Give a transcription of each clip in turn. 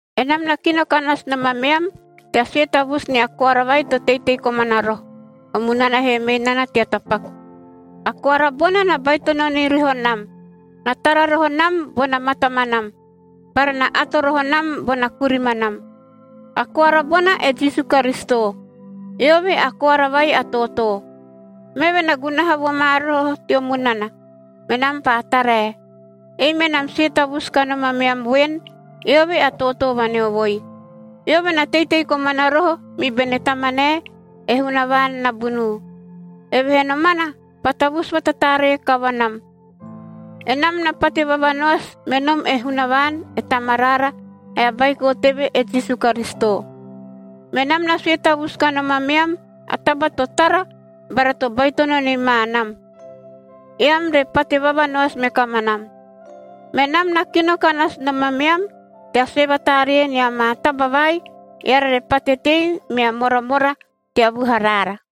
Enam na kino ka nasu nom ameam, tea sue tavusu nia koara vai to teitei komana roho, o munana he mei nana tea tapaku. A koara bona na baitono ni roho nam. Na tara roho nam bona matamanam bara na ato roho nam bona kurimanam. A koara bona, e Jisu Karisito. Eove a Koara vai a Tootoo. Meve na gunaha vo ma roho teo munana, menam paa tarae. Ei menam sue tavusu kanom ameam voen, eove a tootoo vaneovoi. Eove na teitei komana roho mi bene Tamanae, e Hunavaan nabunuu. Evehee nomana paa tavusu vatataaree kavanam. Enam na pate vavanoasi me nom e Hunavaan, e Tamaraara, ae a Baiko teve, e Jisu Karisito. Menam na sue tavusu kanom ameam a taba to tara bara to baitono ni ma nam, eam re pate vavanoasi me kamanam. Menam na kino ka nasu nom ameam tea sue vataaree nia maa taba vai, eara re pate tei mea moramora tea vuharaara.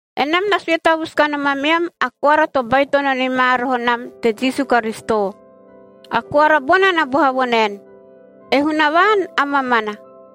Enam na sue tavusu kanom ameam a koara to baitono ni ma roho nam te Jisu Karisito. A koara bona na boha vo naen, e Hunavaan a mamana.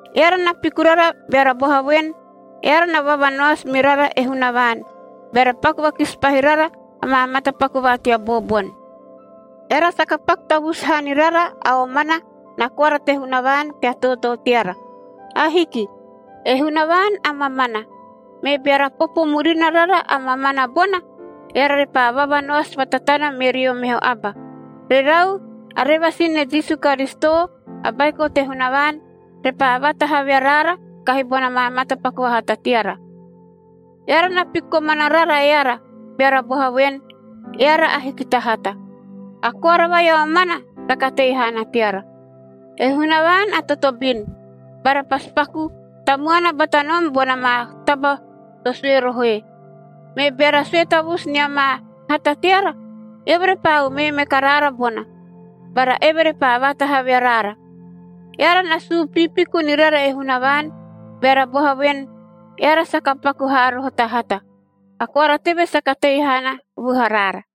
Eara na piku rara beara boha voen, eara na vavanoasi mi rara e Hunavaan, beara paku vakisi pahi rara amaa matapaku va tea booboni. Eara saka paku tavusu haa ni rara a omana na koara te Hunavaan tea tootoo teara. Ahiki. E Hunavaan a mamana. Me beara popo murina rara a mamana bona, eara repaa vavanoasi vatatana me rio meho aba. Rerau, a revasin ne Jisu Karisito, a Baiko te Hunavaan repaa vaatahavi araara kahi bona maa matapaku vahata teara. Eara na piku komana rara eara, beara boha voen, eara ahiki ta hata. A koara vai a omana saka tei haana teara. E Hunavaan a totobin bara pasi paku tamuana bata nom bona maa taba to sue rohoe. Me beara sue tavusu nia maa hata teara, eove repaa umee me karaara bona, bara eve repaa vaatahavi araara. Eara na suu piipiku ni rara e Hunavaan beara boha voen, eara saka paku haa roho ta hata. A koara teve saka tei haana vuharaara.